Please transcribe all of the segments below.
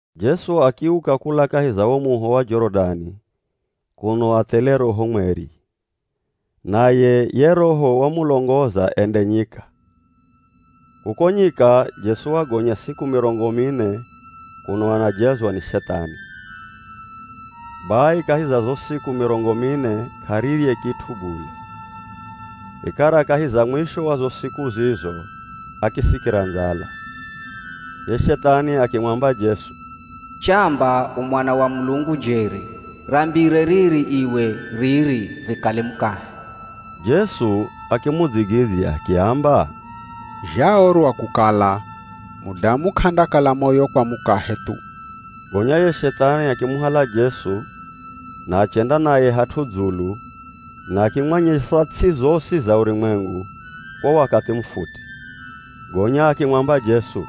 Jesu akiuka kula kahi za wo muho wa Jorodani kuno athele Roho Mweri, naye ye Roho wamulongoza ende nyika. Kuko nyika Jesu wagonya siku mirongo mine kuno anajezwa ni Shethani. Bai kahi za zo siku mirongo mine k'arirye kit'u bule. Vikara kahi za mwisho wa zo siku zizo akisikira ndzala. Ye Shethani akimwamba Jesu, “Chamba u Mwana wa Mulungu jeri, rambire riri iwe riri rikale mukahe.” Jesu akimudzigidzya akiamba, “Zhaorwa kukala, ‘Mudamu k'andakala moyo kwa mukahe thu.’” Gonya ye Shethani akimuhala Jesu na achenda naye hat'u dzulu na akimwanyesa ts'i zosi za urumwengu kwa wakathi mufuti, gonya akimwamba Jesu,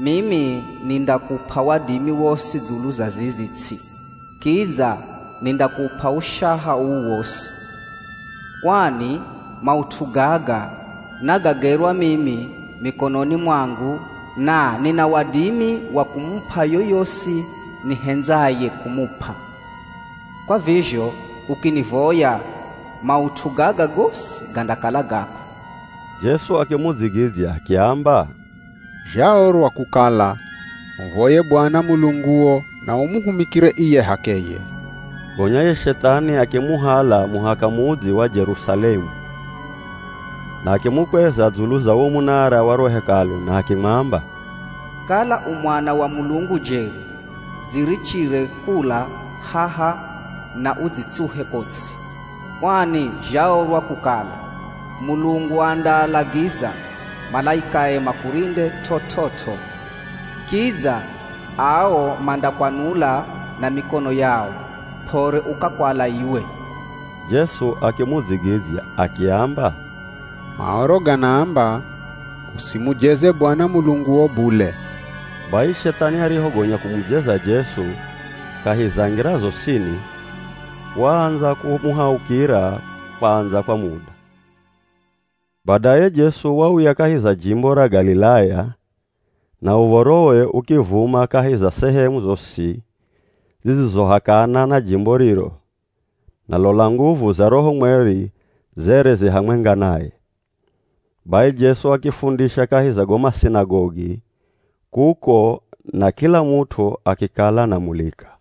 “Mimi nindakup'a wadimi wosi dzulu za zizi ts'i, kidza nindakup'a ushaha uu wosi. Kwani maut'u gaga nagagerwa mimi mikononi mwangu na nina wadimi wa kumup'a yoyosi nihendzaye kumup'a. Kwa vizho ukinivoya, maut'u gaga gosi gandakala gako.” Jesu akimudzigidzya akiamba, “Zhaorwa kukala, ‘Muvoye Bwana Mulunguo na umuhumikire iye h'akeye!’” Gonya ye Shethani akimuhala muhaka mudzi wa Jerusalemu, na akimukweza dzulu za wo munara wa ro Hekalu na akimwamba, “Kala u Mwana wa Mulungu jeri, dzirichire kula haha na udzitsuhe ko ts'i, kwani zhaorwa kukala, ‘Mulungu andaalagiza malaikae makurinde t'ot'ot'o.’ Kidza, ‘Ao mandakwanula na mikono yao, p'ore ukakwala iwe.’” Jesu akimudzigidzya akiamba, “Maoro ganaamba, ‘Usimujeze Bwana Mulunguo bule!’” Bai Shethani arihogonya kumujeza Jesu kahi za ngira zosini, waandza kumuhaukira kwandza kwa muda. Badaye Jesu wauya kahi za jimbo ra Galilaya, na uv̱orowe ukivuma kahi za sehemu zosi zidzizohakana na jimbo riro, na lola nguvu za Roho Mweri zere zi hamwenga naye. Bai Jesu akifundisha kahi za go masinagogi kuko na kila mut'u akikala anamulika.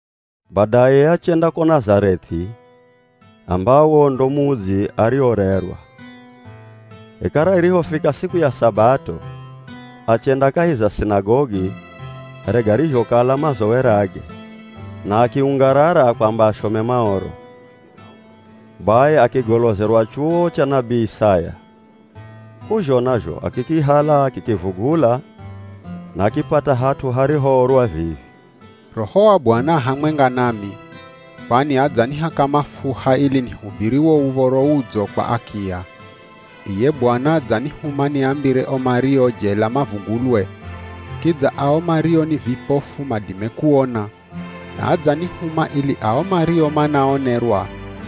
Badaye achenda ko Nazareth'i ambawo ndo mudzi ariorerwa. Vikara irihofika siku ya Sabato, achenda kahi za sinagogi here garizhokala mazowerage, na akiungarara kwamba ashome Maoro. Bai akigolozerwa chuwo cha nabii Isaya. K'uzhona zho akikihala akikivugula na akipata hat'u harihoorwa vivi: “Roho wa Bwana a hamwenga nami, kwani adzanihaka mafuha ili nihubiri wo Uv̱oro Udzo kwa akiya. Iye Bwana adzanihuma niambire o mario jela mavugulwe. Kidza ao mario ni vipofu madime kuona, na adzanihuma ili ao mario manaonerwa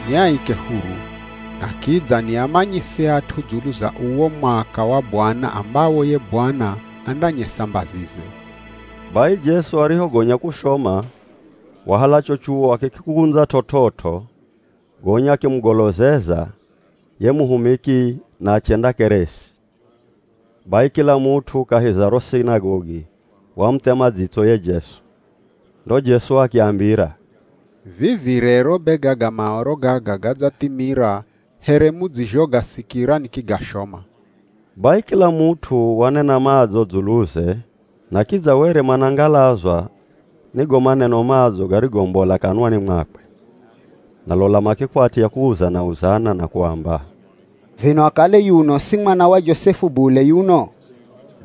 niaike huru, na kidza niamanyise at'u dzulu za uwo mwaka wa Bwana ambawo ye Bwana andanyesa mbazize.” Bai Jesu arihogonya kushoma wahala cho chuwo akikikundza t'ot'ot'o gonya akimugolozeza ye muhumiki na achendakeresi. Bai kila mut'u kahi za ro sinagogi wamuthema dzitso ye Jesu. Ndo Jesu akiambira, “Vivi rero be gaga Maoro gaga gadzathimira here mudzizhogasikira nikigashoma.” Bai kila mut'u wanena madzo dzuluze na kidza were manangalazwa ni go maneno madzo garigombola kanwani mwakwe. Na lola makikwatya kuuzana-uzana na kuamba, “Vino akale yuno si mwana wa Josefu bule yuno?”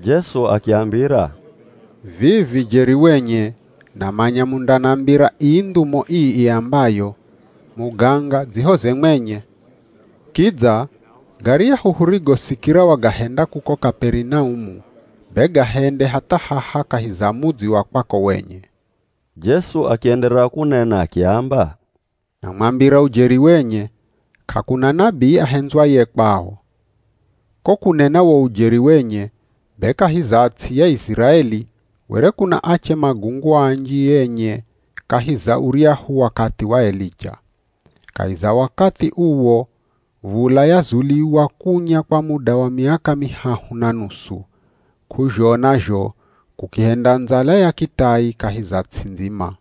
Jesu akiambira, “Vivi jeri wenye namanya mundanambira ii ndhumo ii iambayo, ‘Muganga dzihoze mwenye.’ Kidza garyahu hurigosikira wagahenda kuko Kaperinaumu be gahende hatha haha kahi za mudzi wa kwako wenye.” Jesu akienderera kunena akiamba, “Namwambira ujeri wenye, k'akuna nabii ahendzwaye kwao. Ko kunena wo ujeri wenye, be kahi za ts'i ya Iziraeli were kuna ache magungu anji enye kahi za uryahu wakathi wa Elija. Kahi za wakathi uwo v̱ula yazuliwa kunya kwa muda wa miaka mihahu na nusu, k'uzhona zho kukihenda ndzala ya kitai kahi za ts'i ndzima.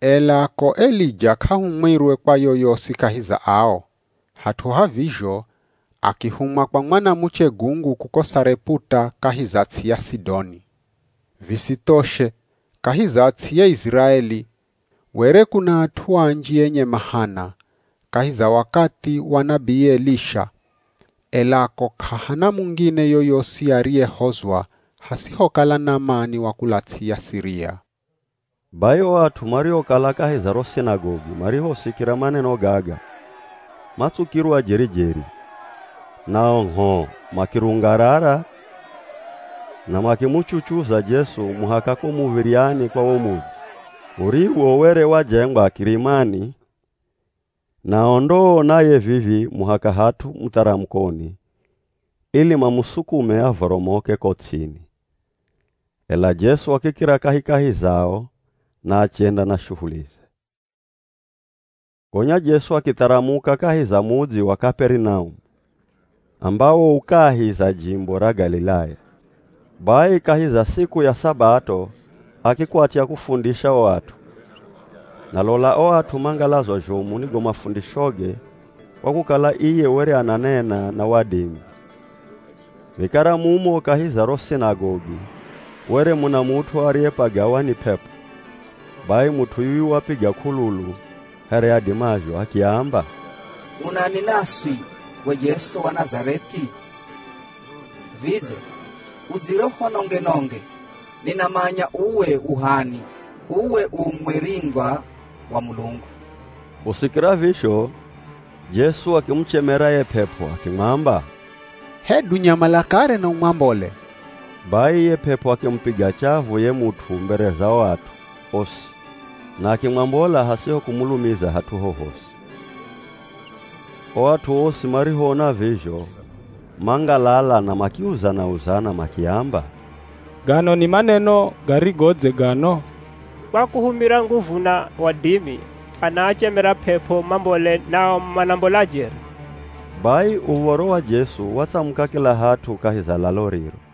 Ela ko Elija k'ahumwirwe kwa yoyosi kahi za ao, hat'u ha vizho, akihumwa kwa mwanamuche gungu kuko Sareputa kahi za ts'i ya Sidoni. Visithoshe kahi za ts'i ya Iziraeli were kuna at'u anji enye mahana, kahi za wakathi wa nabii Elisha, ela ko k'ahana mungine yoyosi ariyehozwa hasihokala Namani wa kula ts'i ya Siria.” Bai o at'u mariokala kahi za ro sinagogi marihosikira maneno gaga, matsukirwa jeri-jeri, nao ngh'o makirungarara na makimuchuchuza Jesu muhaka ko muv̱iryani kwa wo mudzi, uriwo were wajengwa kirimani. Nao ndoo naye vivi muhaka hat'u mutharamukoni, ili mamusukume avoromoke ko ts'ini. Ela Jesu akikira kahikahi zao na achenda na shuhulize. Gonya Jesu akitharamuka kahi za mudzi wa Kaperinaumu ambawo u kahi za jimbo ra Galilaya. Bai kahi za siku ya Sabato akikwatya kufundisha o at'u. Na lola o at'u mangalazwa zhomu ni go mafundishoge kwa kukala iye were ananena na wadimi. Vikara mumo kahi za ro sinagogi were muna mut'u ariyepagawa ni p'ep'o. Bai mut'u yuyu wapiga k'ululu here adimazho, akiamba, “Unani naswi we Jesu wa Nazareth'i? Vidze udzire uhunonge-nonge? Ninamanya uwe u h'ani. Uwe u Mweringwa wa Mulungu!” Kusikira vizho Jesu akimuchemera ye p'ep'o, akimwamba, “Hedu nyamala kare na umwambole!” Bai ye p'ep'o akimupiga chavu ye mut'u mbere za o at'u osi na akimwambola hasiho kumulumiza hat'u hohosi. O at'u osi marihoona vizho mangalala na makiuzana-uzana makiamba, “Gano ni maneno garigodze gano! Kwa kuhumira nguvu na wadimi anaachemera p'ep'o mambole nao manambola jeri!” Bai uv̱oro wa Jesu watsamuka kila hat'u kahi za lalo riro.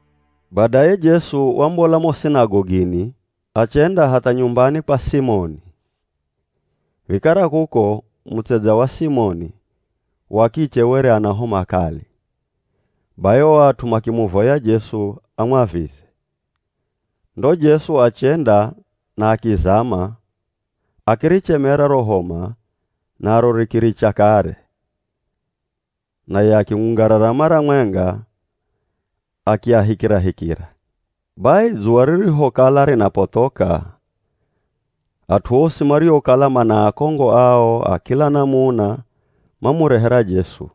Badaye Jesu wambola mo sinagogini achenda hatha nyumbani kwa Simoni. Vikara kuko, mutsedza wa Simoni wa kiche were ana homa kali, bai o at'u makimuvoya Jesu amwavize. Ndo Jesu achenda na akizama, akirichemera ro homa naro rikiricha kare, naye akiungarara mara mwenga, akiahikirahikira. Bai dzuwa ririhokala rinapothoka, at'u osi mariokala mana akongo ao a kila namuna mamurehera Jesu,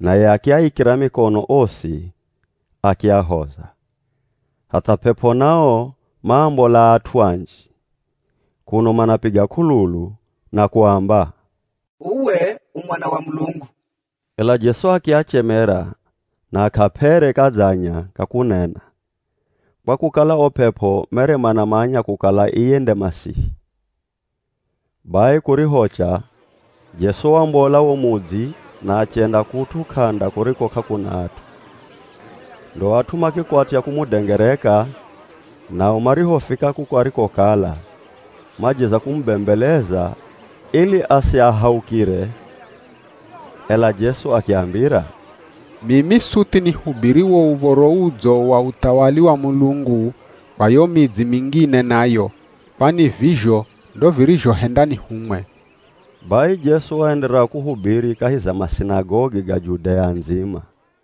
naye akiaikira mikono osi akiahoza. Hatha p'ep'o nao maambola at'u anji kuno manapiga k'ululu na kuamba, “Uwe u Mwana wa Mulungu!” Ela Jesu akiachemera na k'aap'ere kadzanya ka kunena, kwa kukala o p'ep'o mere manamanya kukala iye nde Masihi. Bai kurihocha, Jesu wambola wo mudzi na achenda kut'u k'anda kuriko k'akuna at'u. Ndo at'u makikwatya kumudengereka, nao marihofika kuko arikokala, majeza kumubembeleza ili asiahaukire. Ela Jesu akiambira, “Mimi suthi nihubiri wo Uv̱oro Udzo wa uthawali wa Mulungu kwa yo midzi mingine nayo, kwani vizho ndo virizhohenda nihumwe.” Bai Jesu waenderera kuhubiri kahi za masinagogi ga Judea ndzima.